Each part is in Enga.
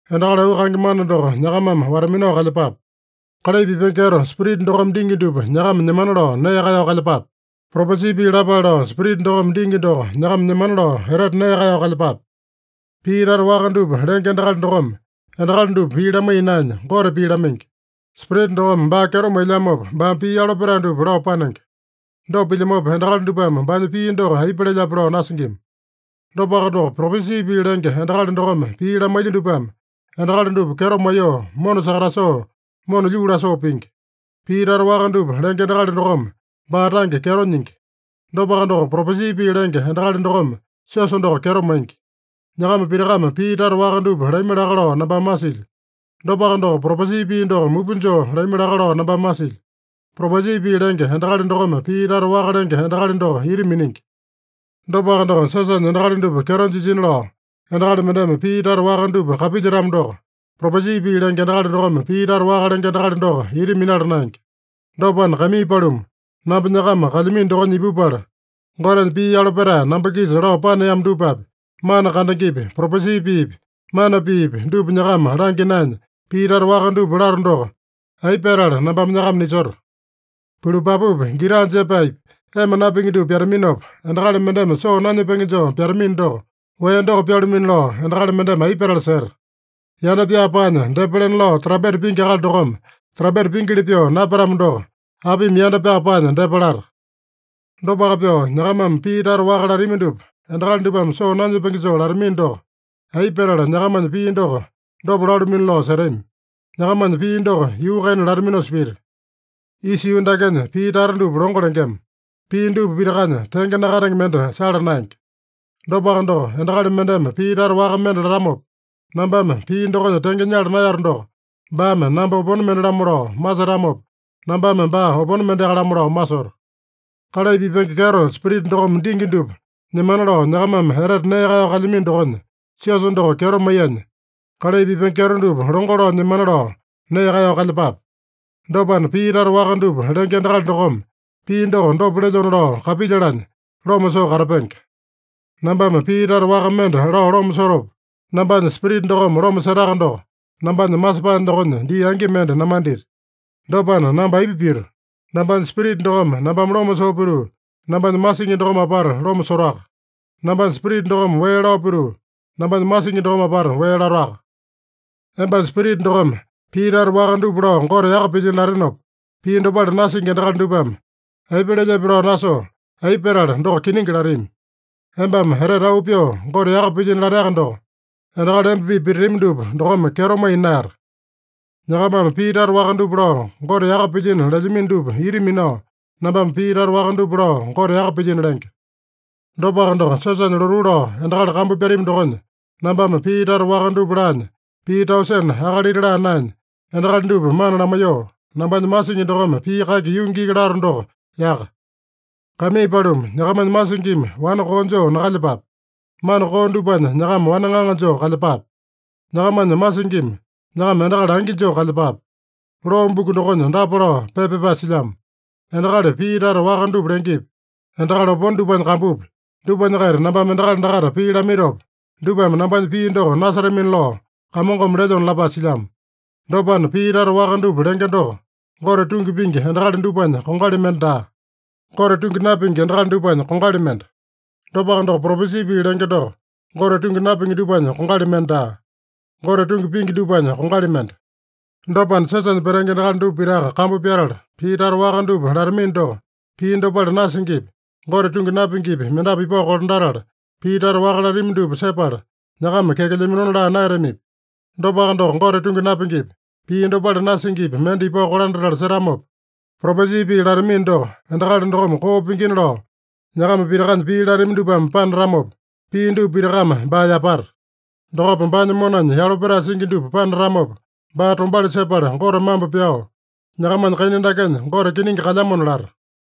Endakali auu kaenge mana doko nyakamame wata-minao kalyepape. Kalai pipenge kyeto Spirita dokome dingi dupa nyakama nyemana lao nee kaeyao kalyepape. Propesi pii lapale lao Spirita dokome dingi doko nyakama nyemana lao etete nee kaeyao kalyepape. Pii tata waka dupa lenge endakali dokome endakali dupa pii lamaiya naenya, Gote pii lamaingi. Spirita dokome baa kyeto mailyamopa, baame pii yalo petae dupa lao panenge. Dopa pilyamopa, endakali dupame baanya pii doko aipa lelyape lao nasingima. Dopaka doko, propesi pii lenge endakali dokome pii lamailya dupame, endakali dupa kyeto maiyoo, mona sakatasoo, mona lyuu lasoo pingi. Pii tata waka dupa lenge endakali dokome baa tange kyeto nyingi. Dopaka doko, propesi pii lenge endakali dokome siosa doko kyeto maingi. Nyakama pitakame pii tata waka dupa lami laka lao nambame masilyo. Dopaka doko, propesi pii doko mupa joo lami laka lao nambame masilyo. Propesi pii lenge endakali dokome pii tata waka lenge endakali doko ita miningi. Dopaka doko, siosanya endakali dupa kyeto jisina lao endakali mendeme pii tata waka dupa kapilyetamo doko, propesi pii lenge endakali dokome pii tata waka lenge endakali doko ita minala naenge. Dopana, kaimii paluma, namba nyakama kalyamino dokonya ipupala, Gotenya pii yalo petae namba-kisa lao paneamo dupapi, mana kandengepi, propesi piipi, mana piipi, dupa nyakama langya naenya, pii tata waka dupa lato doko, aipa petala nambame nyakama nisoto? Pulupapupi, gita jepaepi, ema napingi dupa pyataminopa, endakali mendeme soo nanyepenge joo pyatamino doko, wee doko pyalumino lao endakali mendeme aipa petala seta? Yanda pyaa paanya depa lena lao trampeta pingi akali dokome trampeta pingili pyoo napyatamo doko, apimi yanda pyaa paanya depa lata? Dopaka pyoo, nyakamame pii tata waka latami dupa endakali dupame soo nanyepenge joo latamino doko, aipa petala nyakamanya pii doko dopa lalumino lao setami? Nyakamanya pii doko yuu kaina lataminosa pita. Isa yuu dakenya pii tata dupa longo lengema. Pii dupa pitakanya tenge nakatenge mende sala naenge. Dopaka doko, endakali mendeme pii tata waka mende latamopa, nambame pii dokonya tenge nyala naeyato doko, baame namba opone mende-lamo lao masetamopa, nambame baa opone mendeaka-lamo lao masoto. Kalai pipenge kyeto Spirita dokome dingi dupa nyemana lao nyakamame etete nee kaeyao kalyamino dokonya, siosa doko kyeto maiyanya, kalai pipenge kyeto dupa longo lao nyemana lao nee kaeyao kalyepape. Dopana, pii tata waka dupa lenge endakali dokome pii doko dopa lelyona lao kapilyalanya loma soo katapenge. Nambame pii tata waka mende lao loma sotopa, nambanya spirita dokome loma setaka doko, nambanya masepae dokonya dii angi mende namandita. Dopana namba aipa pito? Nambanya spirita dokome nambame loma soo pituu, nambanya masingi dokome apata loma sotoaka. Nambanya spirita dokome wee lao pituu, nambanya masingi dokome apata wee latoaka. Embanya spirita dokome pii tata waka dupa lao Gote yaka pilyino latenopa, pii dopale nasingi endakali dupame aipa lelyepe lao nasoo, aipa petala “Doko kiningi” latami? Embame etete auu pyoo Gote yaka pilyino lateaka doko, endakali emba-pipa pititami dupa dokome kyeto maiya naeyata. Nyakamame pii tata waka dupa lao Gote yaka pilyino lelyamino dupa ita minao, nambame pii tata waka dupa lao Gote yaka pilyino lenge. Dopaka doko, siosanya lotuu lao endakali kambu pyatami dokonya, nambame pii tata waka dupa laanya pii tausene akalita laa naenya, endakali dupa mana lamaiyoo, nambanya masingi dokome pii kaki yungi iki lato doko yaka. Kaimii paluma, nyakamanya masingimi wane koo joo nakalyepape. Mana koo dupanya nyakama wane ŋaŋa joo kalyepape. Nyakamanya masingimi nyakama endakali angi joo kalyepape. Loo buku dokonya dapa lao pepa pyapae silyamo: “Endakali pii tata waka dupa lengepi, endakali opone dupanya kambupi, dupanya-kaita nambame endakali dakaita pii lamaitopa, dupame nambanya pii doko nasetamina lao Kamongome lelyona” lapae silyamo. Dopana, pii tata waka dupa lenge doko, Gote tungi pingi endakali dupanya kongali mende daa. Gote tungi napingi endakali dupanya kongali mende. Dopaka doko, propesi pii lenge doko, Gote tungi napingi dupanya kongali mende daa. Gote tungi pingi dupanya kongali mende. Dopana, siosanya petenge endakali dupa pitaka kambu pyatala, pii tata waka dupa latamino doko, pii dopale nasingipi, Gote tungi napingipi mendapu ipao kolandatala, pii tata waka latami dupa sepala, nyakama kyakelyaminona laa naeyatamipi? Dopaka doko, Gote tungi napingipi, pii dopale nasingipi mende ipao kolandatala setamopa, propesi pii latamino doko, endakali dokome koo pingina lao nyakama pitakanya pii latami dupame panatamopa, pii dupa pitakame baa yapata. Dokopa baanya monanya yalo petae singi dupa panatamopa, baa tombauli sepala Gote mambo pyao, “Nyakamanya kaina dakenya Gote kiningi kalyamona” lata.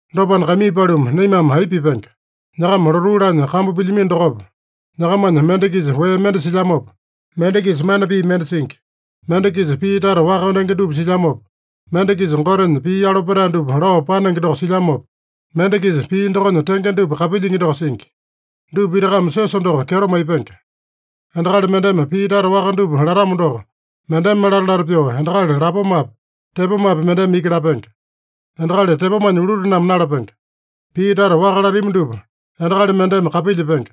Dopana, kaimii paluma, naimame aipa pipenge? Nyakama lotuu laanya kambu pilyamino dokopa, nyakamanya mende-kisa wee mende silyamopa, mende-kisa mana pii mende singi. Mende-kisa pii tata waka lenge dupa silyamopa, mende-kisa Gotenya pii yalo petae dupa lao panenge doko silyamopa, mende-kisa pii dokonya tenge dupa kapilyingi doko singi. Dupa pitakame siosa doko kyeto maipenge. Endakali mendeme pii tata waka dupa latamo doko, mendeme lata-lata pyoo endakali lapomapi, tepomapi mendeme iki lapenge. Endakali tepomanya ulutename nalapenge. Pii tata waka latami dupa endakali mendeme kapilyepenge.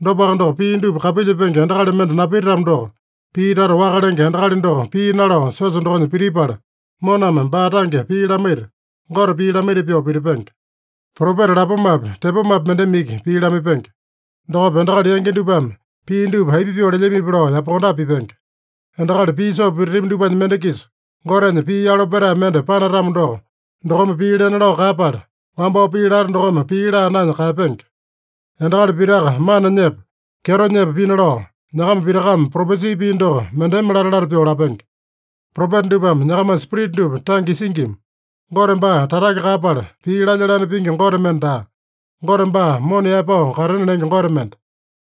Dopaka doko, pii dupa kapilyepenge endakali mende napititamo doko, pii tata waka lenge endakali doko pii nalao siosa dokonya pitipala, moname baa tange pii lamaita, Gote pii lamaita pyoo pitipenge. Propeta lapomapi, tepomapi mendeme iki pii lamaipenge. Dokopa, endakali yangi dupame pii dupa aipa pyoo lelyamipi lao yapakondape pipenge. Endakali pii soo pititami dupanya mende-kisa Gotenya pii yalo petae mende panatamo doko, dokome pii lena lao kaeyapala, wambao pii lata dokome pii laa naenya kaeyapenge. Endakali pitaka mana nyepa, kyeto nyepa pina lao, nyakama pitakame propesi pii doko mendeme lata-lata pyoo lapenge. Propeta dupame nyakamanya spirita dupa tange isingima. Gote baa tatake kaeyapala, pii lalya-lane pingi Gote mende daa. Gote baa mona yaepao katena lenge Gote mende.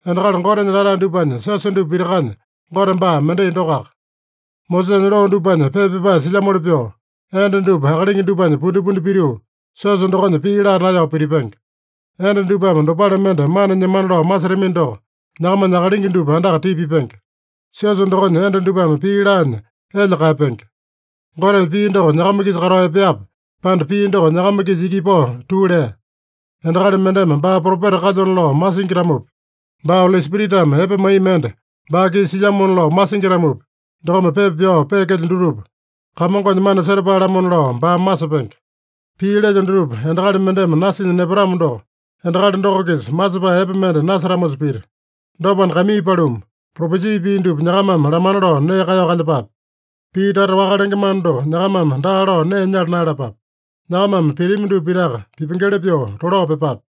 Endakali Gotenya latae dupanya siosa dupa pitakanya Gote baa mendai dokoaka. Mosesanya loo dupanya pepa pyapae silyamoli pyoo, enda dupa akalingi dupanya pundipundi pituu, siosa dokonya pii laa naeyao pitipenge. Enda dupame dopale mende mana nyemana lao masetamino doko, nyakamanya akalingi dupa andaka tipa pipenge. Siosa dokonya enda dupame pii laanya elya kaeyapenge. Gotenya pii doko nyakama-kisa katao epeape, pande pii doko nyakama-kisa iki ipao tuu lea? Endakali mendeme baa propeta kalyona lao masingi-tamopi, baa Oli Spiritame epe maiya mende baa-kisa silyamona lao masingi-tamopi, dokome pepa pyao peekelyo dutupa, Kamongonya mana setapae-lamona lao baame masepenge. Pii lelyo dutupa endakali mendeme nasinya nepatamo doko, endakali doko-kisa masepae epe mende nasetamosa pita. Dopana, kaimii paluma, propesi pii dupa nyakamame lamana lao nee kaeyao kalyepape. Pii tata waka lenge mana doko nyakamame daa lao nee nyala naeyalapape. Nyakamame pitami dupa pitaka pipengeli pyoo tolao pyepape.